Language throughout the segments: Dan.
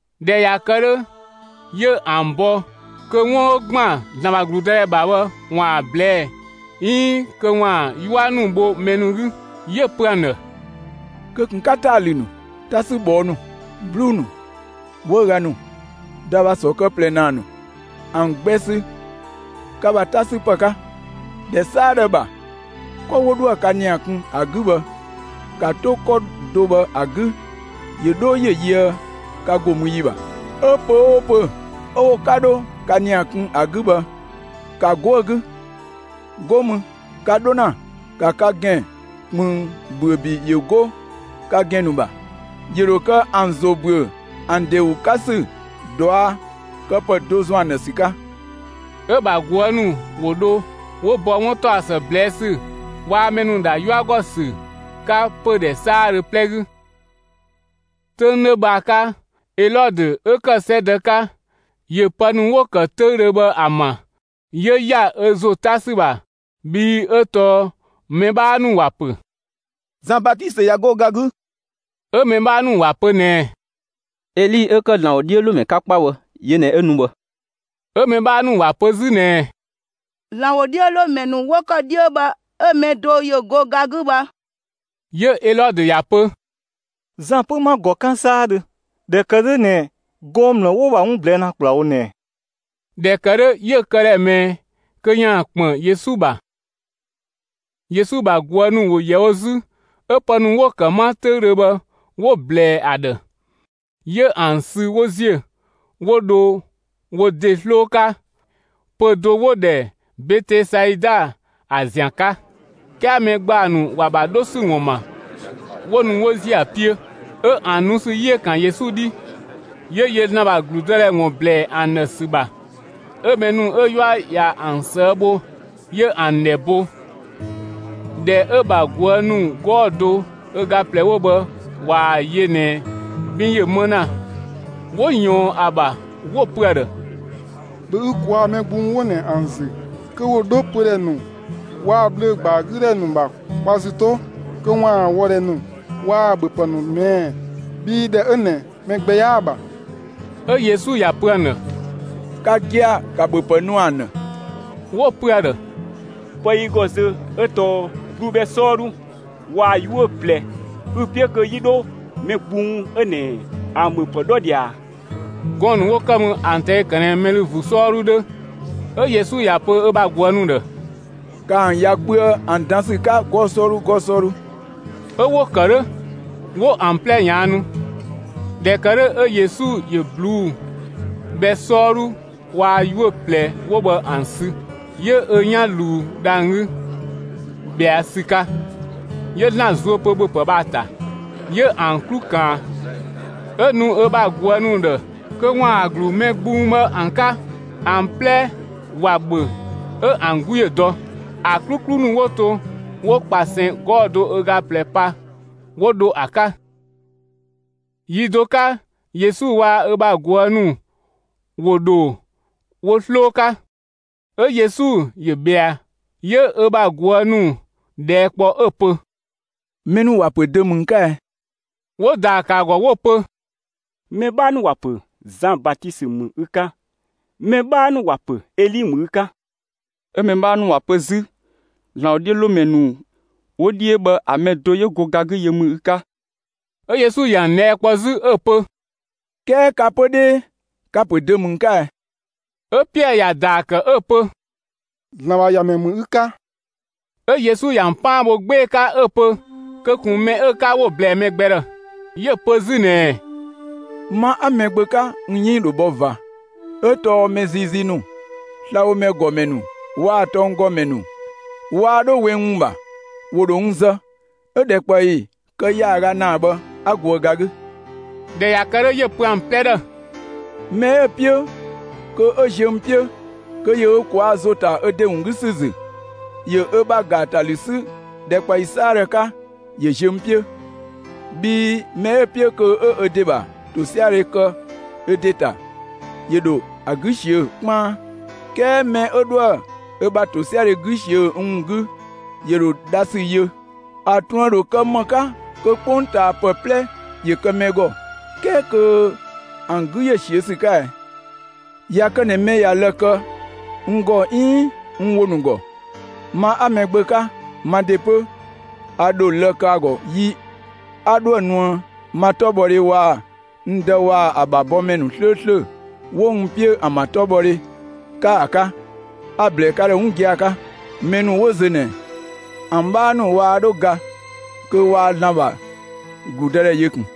꞊Dhɛ ꞊ya kë 'dhö, 'yö ‑an bɔ kö 'wun 'ö ‑gban ‑Zlan ‑bha ‑gludëdhɛ ‑bha bhë ‑waan ‑a ꞊blɛɛ'‑ 'iin kö ‑waan 'yua ‑nu bho mɛ ‑nu 'gü. 'Yö‑ pö ‑an ‑dhë: «Kö ꞊kun 'ka ‑taatalü ‑nu, 'tasübhɔɔ ‑nu, 'bluu‑ ‑nu, 'wëüga ‑nu, ‑dabhasɔ kë ꞊plɛ ‑naa ‑nu, ‑an gbɛ sü ka ‑bha 'ta 'sü ‑pë 'ka! ‑Dhɛ 'saadhö ‑bha, 'kɔ 'wo 'dhoë‑ ka ‑nia kun ‑a 'gü bhë, ‑ka 'to 'kɔ do bhë ‑a 'gü ‑yö 'dho ‑yö yöë ka ‑go mü ‑yi ‑bha. 'Ö pö‑ 'oo pö‑ 'ö 'wo 'ka dho ka ‑nia kun ‑a 'gü bhë, ‑ka 'go ‑a 'gü. 'Go mü, ka 'dho ‑na, ‑ka ka ‑gɛn ꞊kpënng ‑büö ‑bi ‑yö 'go ka ‑gɛn ‑nu ‑bha, ‑yö ‑dho kë ‑an ‑zo ‑büö ‑an ‑de ‑wun 'ka ‑sü ꞊duakëpë do ‑zɔn ‑an ‑dhë ‑sü 'ka.» 'Ö‑ ‑bha ꞊guë' ‑nu ‑wo dho 'wo bɔ 'wuntaɔsë ꞊blɛɛ' ‑sü waa‑ mɛ ‑nu ‑dha 'yua ‑gɔ ‑sü 'ka pödhɛ 'saadhö 'plɛ 'gü. 'Töng 'dhö bhë ‑a 'ka, Elɔdö 'ö ‑kë 'sɛdë 'ka, ‑yö pë ‑nu 'wo‑ ‑kë 'töüdhö bhë ‑a ‑ma; 'yö ‑ya ö ‑zo 'ta ‑sü ‑bha, bhii 'ö tɔɔ mɛ 'bhaa ‑nu ‑wa ‑pö: «Zan Batisö ꞊ya 'go ga 'gü!» 'Ö mɛ 'bhaa ‑nu ‑wa pö ꞊nɛɛ: «Eli 'ö ‑kë ‑Zlan ‑wodhiölomɛ 'ka 'kpa bhë yö ꞊nɛ 'ö nu bhë!» 'Ö mɛ 'bhaa ‑nu ‑wa pö 'zü ꞊nɛɛ: «‑Zlan ‑wodhiölomɛ ‑nu 'wo ‑kë 'dhiö bhë 'ö‑ mɛ do ‑yö go ga 'gü bhë!» 'Yö Elɔdö ‑ya ‑pö: «Zan 'pö 'ma‑ ‑gɔ 'kan 'saadhö, ꞊dhɛ ‑kë 'dhö ꞊nɛ gɔɔn‑ ‑mlë 'wo‑ ‑bha 'wun ‑nu ꞊blɛɛ' ‑na ‑kplawo ꞊nɛ ꞊ɛ?» ꞊Dhɛ ‑kë 'dhö 'yö‑ këdhɛ ꞊mɛɛ kö ‑yaan ‑kpën Yesu ‑bha. Yesu ‑bha ꞊guë' ‑nu ‑wo ‑yɛ wo 'zü, 'ö pë ‑nu 'wo‑ ‑kë 'ma 'töüdhö bhë 'wo‑ ꞊blɛɛ ‑a ‑dhë. 'Yö ‑an sü 'wo ‑ziö, 'wo dho wo ‑de 'sloo 'ka pö‑ do 'wo‑ ‑dhɛ Betesaida ‑a ‑zian 'ka. 'Kɛɛ mɛ ‑gbaa ‑nu ‑wa ‑bha 'dho ‑sü ‑wun ‑ma, 'wo nu 'wo ‑ziö ‑a 'piö. 'Ö ‑an nu ‑sü 'yi ‑yö ‑kan Yesu 'dhi; 'yö yö ‑Zlan ‑bha ‑gludëdhɛ ‑wun ‑blɛɛ ‑an ‑dhë ‑sü ‑bha, 'ö mɛ ‑nu 'ö 'yua ꞊ya ‑an ꞊sëë' bho, 'yö ‑an ‑dhɛ bo. ꞊Dhɛ 'ö‑ ‑bha ꞊guë' ‑nu 'gɔɔ‑ do ö ga ꞊plɛ 'wo bhë ꞊waa‑ yö ꞊nɛ 'bin ‑yö 'më ‑na, 'wo ꞊yɔɔn ‑a ‑bha, 'wo‑ pö ‑a ‑dhë: «‑Bhö ü ꞊kwaa' mɛ gbung 'wo ꞊nɛ ‑an ‑zü kö ‑wo 'dho pödhɛ ‑nu waa‑ bhlö‑ ‑gbaa 'gü ‑dhɛ ‑nu ‑bha kwa ‑zü 'to kö ‑waan wɔdhɛ ‑nu waa‑ ‑bhöpë ‑nu ꞊mɛɛ'‑, bhii ‑dhɛ 'ö ꞊nɛ mɛ gbɛ 'yaa‑ ‑bha.» 'Ö Yesu ‑ya ‑pö ‑an ‑dhë: «Ka gia‑, ‑ka ‑bhöpë nu ‑an ‑dhë!» 'Wo‑ pö ‑a ‑dhë: «Pë 'ö yi ‑gɔ zö 'ö tɔɔ ꞊bluu'‑ bhɛ 'sɔɔdhu waa‑ 'yuö‑ ꞊plɛ. Ü‑ 'piö kö 'yi 'dho mɛ gbung 'ö ꞊nɛ ‑an ‑bha ‑bhöpë 'dhɔ ꞊dhia ꞊a?» Gɔɔn‑ ‑nu 'wo ‑kë mü ‑an ꞊tɛi' ‑kë ꞊nɛ mɛ ‑lü ‑vuu 'sɔɔdhu 'dhö. 'Ö Yesu ‑ya pö ö bha ꞊guë' ‑nu ‑dhë: «‑Kaa ‑an ‑ya kpöë ‑an dan ‑sü 'ka 'gɔɔ‑ 'sɔɔdhu 'gɔɔ‑ 'sɔɔdhu!» 'Ö 'wo‑ ‑kë 'dhö, 'wo ‑an 'plɛ ꞊yaannu. ꞊Dhɛ ‑kë 'dhö 'ö Yesu ‑yö ꞊bluu'‑ bhɛ 'sɔɔdhu waa‑ 'yuö‑ ꞊plɛ 'wo bhë ‑an sü, 'yö ö 'yan ꞊luu dhang‑ 'gü ꞊bhɛa' ‑sü 'ka, 'yö ‑Zlan zuö pö ‑bhöpë bhë ‑a ‑ta, 'yö ‑an 'klu ꞊kaan, 'ö‑ nu ö bha ꞊guë' ‑nu ‑dhë kö ‑waan ‑a ‑glu mɛ gbung bhë ‑an 'ka. ‑An 'plɛ ‑wa ‑bhö 'ö ‑an 'gu ‑yö dɔ. ‑A 'kluklu ‑nu 'wo to, 'wo ꞊kpasɛn 'gɔɔ‑ do ö ga ꞊plɛ pa, 'wo dho ‑a 'ka. Yi do 'ka Yesu waa‑ ö ‑bha ꞊guë' ‑nu ‑wo ‑dho wo 'sloo 'ka, 'ö Yesu ‑yö ‑bhɛa. 'Yö ö ‑bha ꞊guë' ‑nu ꞊dhɛɛ' kpɔ 'ö‑ pö: «Mɛ ‑nu ‑wa ‑pö dö ‑mü n 'ka ɛ?» 'Wo ‑daa ‑kë ‑a ‑gɔ 'wo‑ pö: «Mɛ 'bhaa ‑nu ‑wa pö Zan Batisö ‑mü ü 'ka; mɛ 'bhaa ‑nu ‑wa ‑pö Eli ‑mü ü 'ka, 'ö mɛ 'bhaa ‑nu ‑wa pö 'zü ‑Zlan ‑wodhiölomɛ ‑nu 'wo 'dhiö bhë ‑a mɛ do 'yö go ga 'gü yö ‑mü ü 'ka.» 'Ö Yesu ‑yö ‑an ꞊dhɛɛ' kpɔ 'zü 'ö‑ pö: «'Kɛɛ ka 'pö 'dhee, ka‑ ‑pö dö ‑mü n 'ka ɛ?» 'Ö Piɛɛ ‑ya ‑daa ‑kë 'ö‑ pö: «‑Zlan ‑bha ‑Yamɛ ‑mü ü 'ka!» 'Ö Yesu ‑yö ‑an 'paan bho 'gbee‑ 'ka ꞊nɛ kö ꞊kun mɛ 'ö‑ 'ka 'wo‑ ꞊blɛɛ mɛ gbɛ ‑dhë. 'Yö‑ pö 'zü ꞊nɛɛ: «Ma 'a Mɛgbö 'ka n 'yënng ‑dho bhɔ ꞊va, 'ö tɔɔ mɛ ziizii ‑nu, slabhomɛ ‑gɔmɛ ‑nu waa‑ tɔnggɔmɛ ‑nu waa 'dho 'we n ‑wun ‑bha; ‑wo ‑dho n zë; 'ö‑ ‑dhɛkpaɔyi kë ‑yaaga ‑naa bhë 'a goë ga 'gü.» ꞊Dhɛ ꞊ya kë 'dhö, 'yö‑ pö ‑an 'plɛ ‑dhë: «Mɛ 'ö‑ 'piö kö 'ö ziö n 'piö, kö ‑yö ö ꞊kwaa' ‑zo ‑ta ö ‑de ‑wun 'gü ‑sü ‑zü, ‑yö ö ‑bha ‑gaatalü 'sü ‑dhɛkpaɔyi 'saadhö 'ka, ‑yö ziö n 'piö. Bhii mɛ 'ö‑ 'piö kö 'ö ö ‑de ‑bha ‑tosiadhe kë ö ‑de ‑ta, ‑yö ‑dho ‑a 'gü ꞊siö'‑ 'kpaan, 'kɛɛ mɛ 'ö 'dhoë‑ ö bha ‑tosiadhe 'gü ꞊siö'‑ n ‑wun 'gü, ‑yö ‑dho dha ‑sü yö. ‑A ꞊truën ‑dho kë ‑më 'ka kö 'kpongtaapë 'plɛ ‑yö ‑kë mɛ ‑gɔ, 'kɛɛ kö ‑an 'gü ‑yö ꞊siö'‑ ‑sü 'ka ɛ? ꞊Ya kë ꞊nɛ mɛ ꞊ya lë‑ kë n ‑gɔ 'iin n ‑wo ‑nu ‑gɔ, ma 'a Mɛgbö 'ka, ma ‑de 'pö a ‑dho lë‑ kë ‑a ‑gɔ yi 'a 'dhoë‑ nuë ma 'tɔbhɔdhe waa‑ n Dë waa‑ ‑a ‑bha bɔmɛ ‑nu 'slööslö 'wo n 'piö ‑an ‑bha 'tɔbhɔdhe 'ka ‑a 'ka. A‑ ‑blɛɛ ka ‑dhë 'wun gia‑ 'ka: Mɛ ‑nu 'wo zö ꞊nɛ, ‑an 'bhaa ‑nu waa 'dho ga kö waa ‑Zlan ‑bha ‑gludëdhɛ yö ꞊kun.»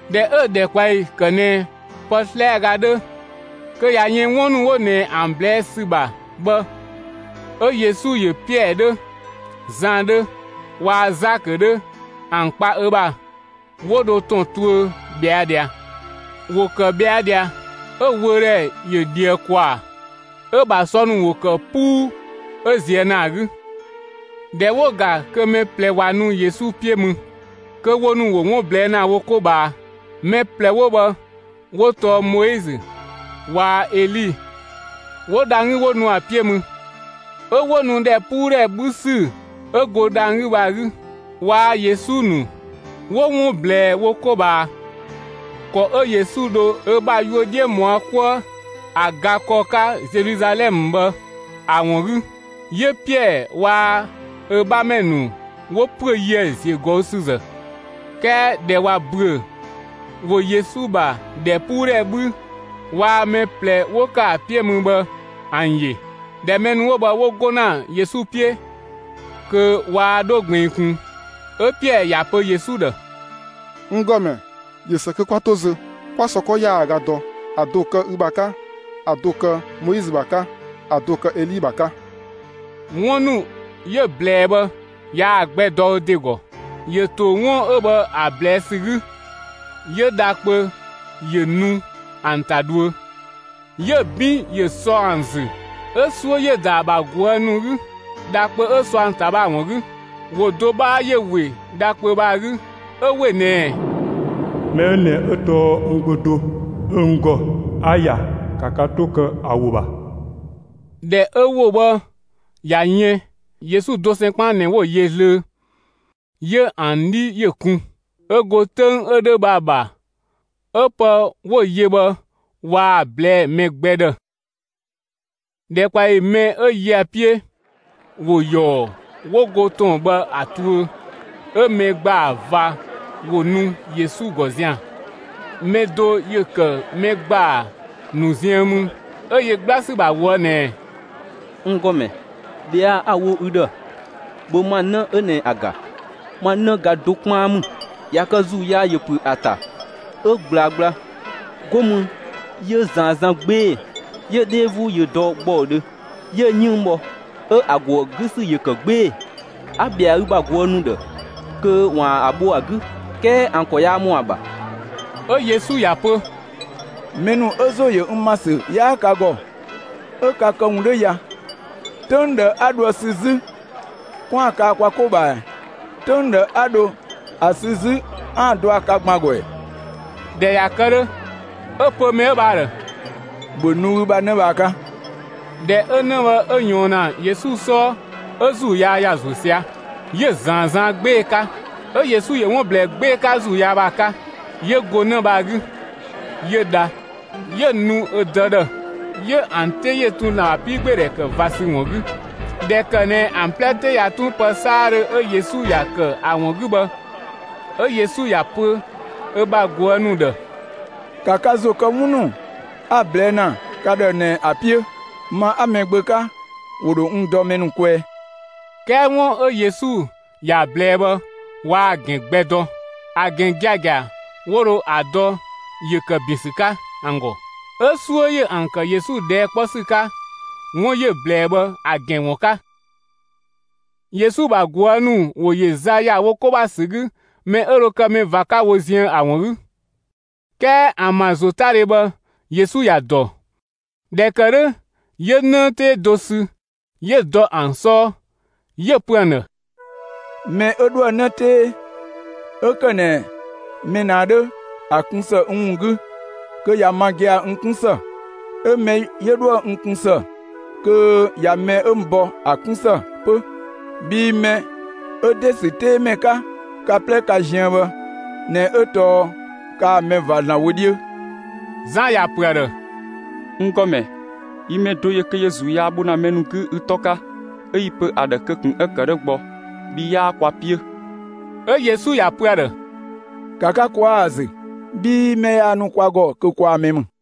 ꞊Dhɛ 'ö‑ ‑dhɛkpaɔyi ‑kë ꞊nɛ pë 'slɛaga 'dhö kö ꞊ya yën 'wun ‑nu 'wo ꞊nɛ ‑an ꞊blɛɛ' ‑sü ‑bha bhë, 'ö Yesu ‑yö Piɛɛ 'dhö, Zan 'dhö waa‑ Zakö 'dhö ‑an kpa ö ‑bha, 'wo dho ‑tɔn tuö ꞊bhɛa' ꞊dhia. ‑Wo ‑kë ꞊bhɛa' ꞊dhia, 'ö‑ wöödhɛ ‑yö ꞊dhië ‑kwaa, 'ö‑ ‑bha sɔ ‑nu ‑wo ‑kë 'puu 'ö ꞊zië' ‑naa 'gü. ꞊Dhɛ 'wo‑ ‑ga kö mɛ ꞊plɛ ꞊wa nu Yesu 'piö mü, kö wo ‑nu ‑wo 'wun ꞊blɛɛ' ‑na wo 'ko ꞊bhaa. Mɛ ꞊plɛ 'wo bhë 'wo tɔɔ Moizö waa‑ Eli 'wo dhang‑ 'gü 'wo nu ‑a 'piö mü. 'Ö 'wo nu ‑dhɛpuudhɛ 'bhü ‑sü 'ö go dhang‑ 'gü bhë ‑a 'gü. Waa‑ Yesu ‑nu ‑wo 'wun ꞊blɛɛ wo 'ko ꞊bhaa ‑kɔ 'ö Yesu dho ö bha yuö 'dhiö ꞊mɔa' 'kuë ‑a ga ‑kɔ 'ka Zeluzalɛmë bhë ‑a ‑wun 'gü. 'Yö Piɛɛ waa‑ ö 'bhamɛ ‑nu ‑wo ‑püö yië‑ ‑ziögɔüsüzë. 'Kɛɛ ꞊dhɛ ꞊wa ‑büö, ‑wo Yesu ‑bha ‑dhɛpuudhɛ 'bhü waa‑ mɛ ꞊plɛ 'wo ‑kë ‑a 'piö mü bhë ‑an ‑yö. ꞊Dhɛ mɛ ‑nu 'wo bhë 'wo 'go ‑na Yesu 'piö (kö waa 'dho ꞊gbiin ꞊kun), 'ö Piɛɛ ‑ya pö Yesu ‑dhë: «N ‑Gɔmɛ, ꞊yö ‑së kö 'kwa 'to zö, 'kwa sɔ 'kɔ ‑yaaga dɔ, ‑a do‑ kë ü ‑bha 'ka, ‑a do‑ kë Moizö ‑bha 'ka, ‑a do‑ kë Eli ‑bha 'ka!» 'Wun ‑nu 'yö‑ ꞊blɛɛ bhë yaa‑ gbɛ dɔ ö ‑de ‑gɔ. ‑Yö ‑to 'wun 'ö bhë ‑a ꞊blɛɛ' ‑sü 'gü, 'yö dha kpö ‑yö ‑nu ‑an ‑ta dhuö, 'yö‑ 'bin ‑yö sɔ ‑an ‑zü. 'Ö 'suö ‑yö ‑da ‑a ‑bha ꞊guë' ‑nu 'gü, dha kpö 'ö sɔ ‑an ‑ta bhë ‑a ‑wun 'gü. ‑Wo do 'bhaa ‑yö ‑we dha kpö bhë ‑a 'gü, 'ö ‑we ꞊nɛɛ: «Mɛ 'ö ꞊nɛ 'ö tɔɔ n Gbö (do 'ö n ‑gɔ,) 'a‑ ‑ya; ‑ka ka 'to kë ‑a ‑wo ‑bha!» ꞊Dhɛ 'ö ‑wo 'ö bhë ꞊ya yën, Yesu dosɛn 'kpaan ꞊nɛ 'wo‑ yö zlöö; 'yö ‑an 'dhi ‑yö kun. 'Ö go 'töng 'ö 'dhö bhë ‑a ‑bha, 'ö pë 'wo‑ yö bhë waa‑ ꞊blɛɛ'‑ mɛ gbɛ ‑dhë. ‑Dhɛkpaɔyi mɛ 'ö yö ‑a 'piö, ‑wo ‑yɔɔ 'wo go ‑tɔn bhë ‑a tuö, 'ö mɛ ‑gbaa ꞊va ‑wo nu Yesu ‑gɔ zian‑. Mɛ do ‑yö ‑kë mɛ ‑gbaa ‑nu ziën mü, 'ö yö 'gbla ‑sü ‑bha ꞊woë' ꞊nɛɛ: «N ‑Gɔmɛ, ꞊bhɛa'‑ 'a‑ wo ü ‑dhë, ‑bhö ma 'në 'ö ꞊nɛ ‑a ‑ga, ma 'në ga do 'kpaan ‑mü! ꞊Ya kë ‑zuu yaa ‑yö ‑püö ‑a ‑ta, 'ö ꞊gblaa gbla, 'go mü 'yö‑ ꞊zaan zan 'gbee‑, 'yö‑ 'dhee 'vuu ‑yö dɔ ‑gbɔudhö; 'yö‑ 'yënng bhɔ; 'ö ‑a ‑go ‑a 'gü ‑sü ‑yö ‑kë 'gbee‑. A‑ ‑bhɛa ü bha ꞊guë' ‑nu ‑dhë kö ‑waan ‑a bho ‑a 'gü, 'kɛɛ ‑an ‑kɔ yaa ‑mɔ ‑a ‑bha.» 'Ö Yesu ‑ya pö: «Mɛ ‑nu 'ö ‑zo ‑yö n ‑ma ‑sü 'yaa ka ‑gɔ, 'ö ka këwun 'dhö ya, 'töng ꞊dhë 'a dho ‑a sü 'zü 'kwaan‑ kaa‑ kwa 'ko ꞊bhaa ꞊ɛ? 'Töng ꞊dhë 'a dho ‑a sü 'zü 'aan‑ dɔ ‑a 'ka ka ‑gban ‑gɔ ‑ɛ?» ꞊Dhɛ ꞊ya kë 'dhö, 'ö‑ pö mɛ 'ö bhë ‑a ‑dhë: «‑Bhö nu ü bha 'në bhë ‑a 'ka!» ꞊Dhɛ 'ö 'në bhë 'ö ꞊yɔɔn ‑na Yesu 'sɔɔ, 'ö ‑zuu yaa ‑ya ‑zuö sia‑, 'yö‑ ꞊zaan zan 'gbee‑ 'ka. 'Ö Yesu ‑yö 'wun ꞊blɛɛ 'gbee‑ 'ka ‑zuu yaa bhë ‑a 'ka, 'yö go 'në bhë ‑a 'gü, 'yö dha, 'yö‑ nu ö dë ‑dhë. 'Ö ‑an 'te ‑yö tun ‑Zlan ‑bha 'piigbeedhɛ ‑kë ꞊va ‑sü ‑wun 'gü. ꞊Dhɛ ‑kë ꞊nɛ ‑an 'plɛ 'te ꞊ya 'tun pë 'saadhö 'ö Yesu ‑ya ‑kë ‑a ‑wun 'gü bhë, 'ö Yesu ‑ya ‑pö ö bha ꞊guë' ‑nu ‑dhë: «‑Ka ka ‑zo kë 'wun ‑nu 'a‑ ꞊blɛɛ' ‑na ka ‑dhë ꞊nɛ ‑a 'piö: Ma 'a Mɛgbö 'ka, ‑wo ‑dho n dɔ mɛ ‑nu kwɛɛ.» 'Kɛɛ 'wun 'ö Yesu ‑ya ꞊blɛɛ bhë, waa‑ ‑gɛn gbɛ dɔ; ‑a ‑gɛn giagia 'wo dho ‑a dɔ ‑yö ‑kë ‑bin ‑sü 'ka ‑an ‑gɔ; 'ö 'suö ‑yö ‑an ‑kë Yesu ꞊dhɛɛ' 'kpɔ ‑sü 'ka 'wun 'yö‑ ꞊blɛɛ bhë ‑a ‑gɛn ‑wun 'ka. Yesu ‑bha ꞊guë' ‑nu ‑wo ‑yö za ‑ya wo 'ko ‑bha ‑sü 'gü mɛ 'ö dho kë mɛ ꞊va 'ka wo ziën ‑a ‑wun 'gü. 'Kɛɛ ‑an ‑bha ‑zotadhe bhë Yesu ‑ya ‑dɔ. ꞊Dhɛ ‑kë 'dhö, 'yö 'në 'tee do sü 'yö‑ dɔ ö 'sɔɔ, 'yö‑ pö ‑an ‑dhë: «Mɛ 'ö 'dhoë‑ 'në 'tee 'ö ‑kë ꞊nɛ mɛ ꞊nɛ ‑a 'dhö ‑a kun ‑së n ‑wun 'gü, kö ꞊ya ma gia‑ n 'kun ‑së; 'ö mɛ 'yö 'dhoë‑ n kun ‑së, kö ꞊ya mɛ 'ö n bɔ, ‑a 'kun ‑së 'pö; bhii mɛ 'ö ‑de ‑sü 'tee ‑mɛ 'ka ka 'plɛ ka ziën bhë ꞊nɛ 'ö tɔɔ kaa‑ mɛ ꞊va ‑Zlan wö 'dhiö.» Zan ‑ya pö ‑a ‑dhë: «N ‑Gɔmɛ, yi mɛ do ‑yö kö ‑yö ‑zuu yaa ‑nu bho ‑na mɛ ‑nu 'gü ü 'tɔ 'ka, 'ö 'yi‑ pö ‑a ‑dhë kö ꞊kun 'ö‑ ‑kë 'dhö gbɔ, bhii 'yaa kwa 'piö.» 'Ö Yesu ‑ya ‑pö ‑a ‑dhë: «‑Ka ka ꞊kwaa' ‑a ‑zü, bhii mɛ yaa nu kwa ‑gɔ kö kwaa‑ mɛ ‑mü.»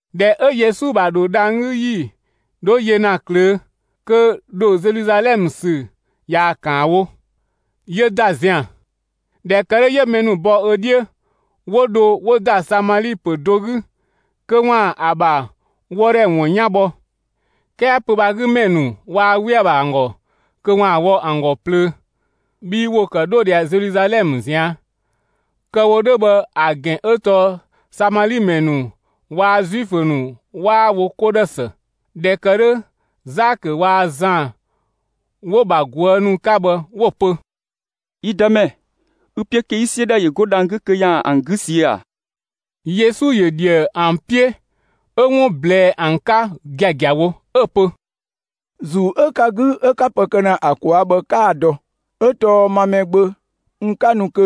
꞊Dhɛ 'ö Yesu ‑bha ‑dho dhang‑ 'gü ‑yi 'dho yö ‑na ꞊klöö', kö ‑dho Zeluzalɛmë ‑sü ꞊yaa‑ ‑kaan wo; 'yö ‑da zian‑. ꞊Dhɛ ‑kë 'dhö, 'yö mɛ ‑nu bɔ ö 'dhiö, 'wo dho 'wo ‑da Samali ‑pö do 'gü kö ‑waan ‑a ‑bha wɔdhɛ ‑wun 'yan bhɔ. 'Kɛɛ pö‑ bhë ‑a 'gü ‑mɛ ‑nu waa 'we ‑a ‑bha ‑an ‑gɔ kö ‑wo wɔ ‑an ‑gɔ plöö, bhii ‑wo ‑kë 'dho ꞊dhia Zeluzalɛmë ꞊zian'. (Kë‑ wo 'dhö bhë ‑a ‑gɛn 'ö tɔɔ Samali ‑mɛ ‑nu waa‑ Zuifö ‑nu 'waa wo 'ko ‑dhë ‑së.) ꞊Dhɛ ‑kë 'dhö, Zakö waa‑ Zan 'wo‑ ‑bha ꞊guë' ‑nu 'ka bhë 'wo‑ pö: «Yi Dëmɛ, ü‑ 'piö kö 'yi 'siö ‑dhɛ 'yö go dhang‑ 'gü kö ‑yaan ‑an 'gü ꞊siö'‑ ‑a?» Yesu ‑yö ‑dhië ‑an 'piö 'ö 'wun ꞊blɛɛ ‑an 'ka giagiawo, ['ö‑ pö: «‑Zuu 'ö ka 'gü 'ö 'ka pë kë ‑na ‑a ꞊kwaa' bhë 'kaa‑ dɔ. 'Ö tɔɔ ma Mɛgbö, n 'ka nu kö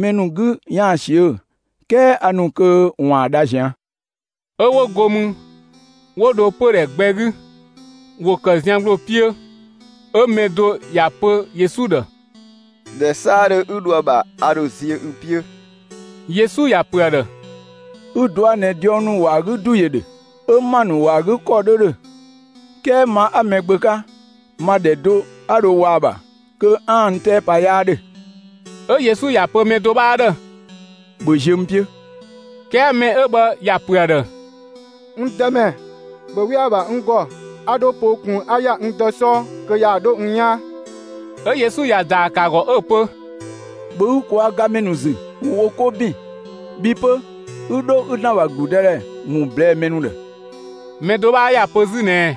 mɛ ‑nu 'gü ‑yaan ꞊siö; 'kɛɛ a ‑nu kö ‑waan dha ꞊zian'.»] 'Ö 'wo go mü, 'wo dho pödhɛ gbɛ 'gü. ‑Wo ‑kë zian ‑gbloo 'piö, 'ö mɛ do ‑ya ‑pö Yesu ‑dhë: «‑Dhɛ 'saadhö 'ü dho ‑a ‑bha, a ‑dho ziö ü 'piö.» Yesu ‑ya pö ‑a ‑dhë: «Ü‑ ꞊dua' ꞊nɛ diɔng ‑wɔ ‑a 'gü ‑du ‑yö ‑dhö, 'ö ‑ma ‑nu ‑wɔ ‑a 'gü ‑kɔ 'dhö ‑dhö, 'kɛɛ ma 'a Mɛgbö 'ka, ma ‑dhɛ do 'a dho wɔ ‑a ‑bha kö 'aan‑ n 'tɛɛ pa 'yaa ‑dhö.» 'Ö Yesu ‑ya pö mɛ do 'bhaa ‑dhë: «‑Bhö ziö n 'piö!» 'Kɛɛ mɛ 'ö bhë ‑ya ‑pö ‑a ‑dhë: «N Dëmɛ, ‑bhö 'we ‑a ‑bha n ‑gɔ, 'a 'dho poo ꞊kun 'a ‑ya n dë 'sɔɔ kö ‑yaan 'dho n 'yaan!» 'Ö Yesu ‑ya ‑daa ‑kë ‑a ‑gɔ 'ö‑ pö: «‑Bhö ü ꞊kwaa' gamɛ ‑nu ‑zü, ‑wo wo 'ko ‑bin, bhi 'pö 'ü 'dho 'ü ‑Zlan ‑bha ‑gludëdhɛ ‑wun ꞊blɛɛ'‑ mɛ ‑nu ‑dhë!» Mɛ do 'bhaa ‑ya pö 'zü ꞊nɛɛ: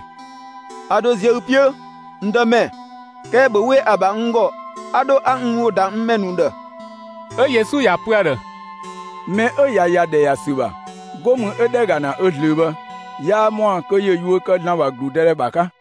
«A ‑dho ziö ü 'piö, n Dëmɛ; 'kɛɛ ‑bhö 'we ‑a ‑bha n ‑gɔ, 'a 'dho 'a n ‑wo ‑da n ‑mɛ ‑nu ‑dhë.» 'Ö Yesu ‑ya pö ‑a ‑dhë: «Mɛ 'ö ꞊ya ‑ya ‑dhɛ ‑ya ‑sü ‑bha, 'go mü 'ö ‑dhɛ ‑ga ‑na ö zlöö bhë, yaa ‑mɔa kö ‑yö yuö kë ‑Zlan ‑bha ‑gludëdhɛ ‑bha 'ka.»